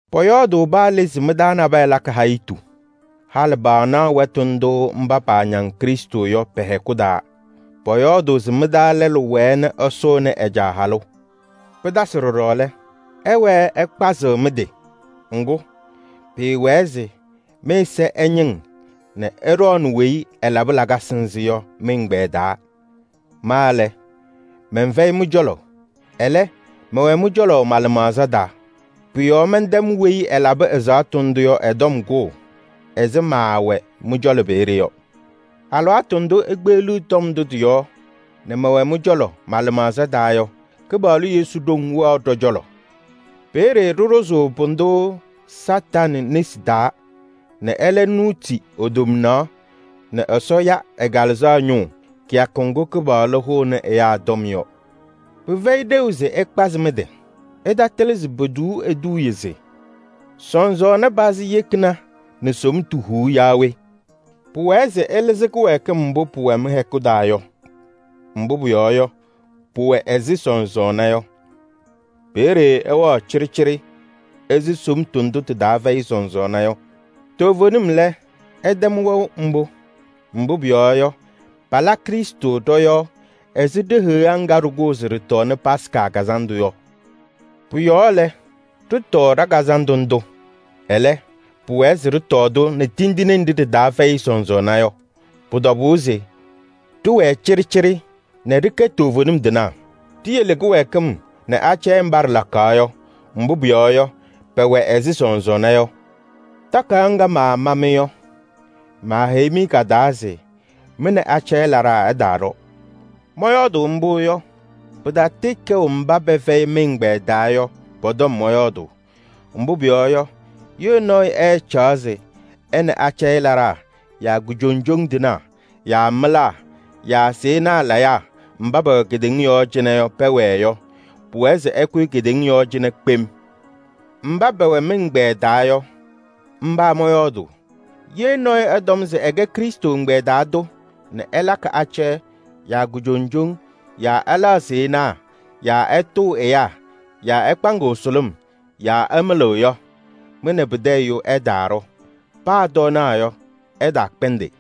Pɔyɔɔdʋʋ paa le se mɩ-taa nabɛyɛ lakɩ hayitu. Halɩ paanaɣ wɛtʋ ndʋ mba paañaŋ Krɩstʋ yɔ pɛ-hɛkʋ taa. Pɔyɔɔdʋʋ se mɩ-taa lɛlʋ wɛɛ ɛsʋʋnɩ ɛ-caa halʋ. Pɩtasɩ ɖɔɖɔ lɛ, ɩwɛɛ ɩkpazɩɣ mɩ-tɩ. Ŋgʋ, pɩɩwɛɛ se mɩ-ɛza ɛñɩŋ nɛ ɩɖɔɔnɩ weyi ɛlabɩ lakasɩ nzɩ yɔ mɩ-ɛgbɛyɛ taa. Ma lɛ, mɛnfɛyɩ mɩ-cɔlɔ, ɛlɛ, mɛwɛ mɩ-cɔlɔ ma-lɩmaɣza taa. Pʋ-yɔɔ mɛntɛm weyi ɛlabɩ ɛzaɣtʋ ndʋ yɔ ɛ-tɔm kʋʋ ɛzɩ maawɛɛ mɩ-cɔlɔ peeye yɔ. Alɩwaatʋ ndʋ ikpeɣliɣ tɔm ndʋ tɩ-yɔɔ nɛ mɛwɛ mɩ-cɔlɔ ma-lɩmaɣza taa yɔ, Kɩpaɣlʋ Yesu ɖoŋ wɛɣ ɖɔ-cɔlɔ. Peeye ɖɩɖʋzʋʋ pʋdʋ Satanɩ nesi taa nɛ ɛlɛ nuuti e-tomnaɣ nɛ Ɛsɔ ya ɛ-Kalɩzaɣ ñʋʋ kɩyakʋ ŋgʋ Kɩpaɣlʋ hʋʋnɩ ɛyaa tɔm yɔ. Pɩfɛyɩ ɖeu se ɩkpazɩ mɩ-tɩ. Ɩtatɩlɩ se potuu eduuye se: “Sɔsɔɔna pazɩ yekina nɛ somtu huu yaa we?” Pʋwɛɛ se ɩlɩzɩ kɩwɛɛkɩm mbʋ pʋwɛ mɩ-hɛkʋ taa yɔ, mbʋ pʋyɔɔ yɔ, pʋwɛ ɛzɩ sɔsɔɔna yɔ. Peeye ɩwɛɣ cɩɖɩcɩɖɩ ɛzɩ somtu ndʋ tɩ-taa fɛyɩ sɔsɔɔna yɔ. Toovenim lɛ, ɩtɛm wɛʋ mbʋ. Mbʋ pʋyɔɔ yɔ, Krɩstʋ sɩbɩ ɖɔ-yɔɔ. Ɛwɛ ɛzɩ heɣa ŋga Yuda ñɩma kʋʋ se pɔtɔɔnɩ po-Yomiye Taa Lɩʋ Kazandʋ. Pʋ-yɔɔ lɛ, ɖɩtɔɔ ɖa-kazandʋ ndʋ. Ɛlɛ, pʋwɛɛ se ɖɩtɔɔ-tʋ nɛ sɔsɔɔna fɛyɩ tindine. Pʋ-tɔbʋʋ se ɖɩwɛɛ cɩɖɩcɩɖɩ nɛ ɖɩkɛ toovenim tɩnaa. Ɖiyele kɩwɛɛkɩm nɛ hayitu mba ɖɩlakaɣ yɔ, mbʋ pʋyɔɔ yɔ, pɛwɛ ɛzɩ sɔsɔɔna yɔ. Takayaɣ ŋga maama-mɩ yɔ, maaheyi-mɩ ka-taa se mɩ nɛ hayitu laɖaa ɩtaaɖɔ. Mɔyɔɔdʋʋ mbʋ yɔ, pɩtatɩɩkɛʋ mba pɛfɛyɩ mɩ-ɛgbɛyɛ taa yɔ, pɔ-tɔm mɔyɔɔdʋʋ. Mbʋ pʋyɔɔ yɔ, ye nɔɔyʋ ɛɛcaɣ se ɛ nɛ hayitu laɖaa yaa kujoŋjoŋ tɩnaa yaa mɩlaa yaa sɩɩnaa layaa mba pɛwɛ kedeŋa yɔɔ cɩnɛ yɔ pɛwɛɛ yɔ, pʋwɛɛ se ɛkʋyɩ kedeŋa yɔɔ cɩnɛ kpem. Mba pɛwɛ mɩ-ɛgbɛyɛ taa yɔ, mba mɔyɔɔdʋʋ. Ye nɔɔyʋ ɛtɔm se ɛkɛ Krɩstʋ ɛgbɛyɛ taa tʋ nɛ ɛlakɩ hayitu yaa kujoŋjoŋ yaa ɛlaɣ sɩɩnaa yaa ɛtʋʋ ɛyaa yaa ɛkpaŋɩɣ sʋlʋm yaa ɛmɩlɩɣ yɔ, mɩ nɛ pɩtɛ ɛyʋ ɩtaaɖɔ, paa tɔɔnaɣ yɔ, ɩtaakpɛndɩ.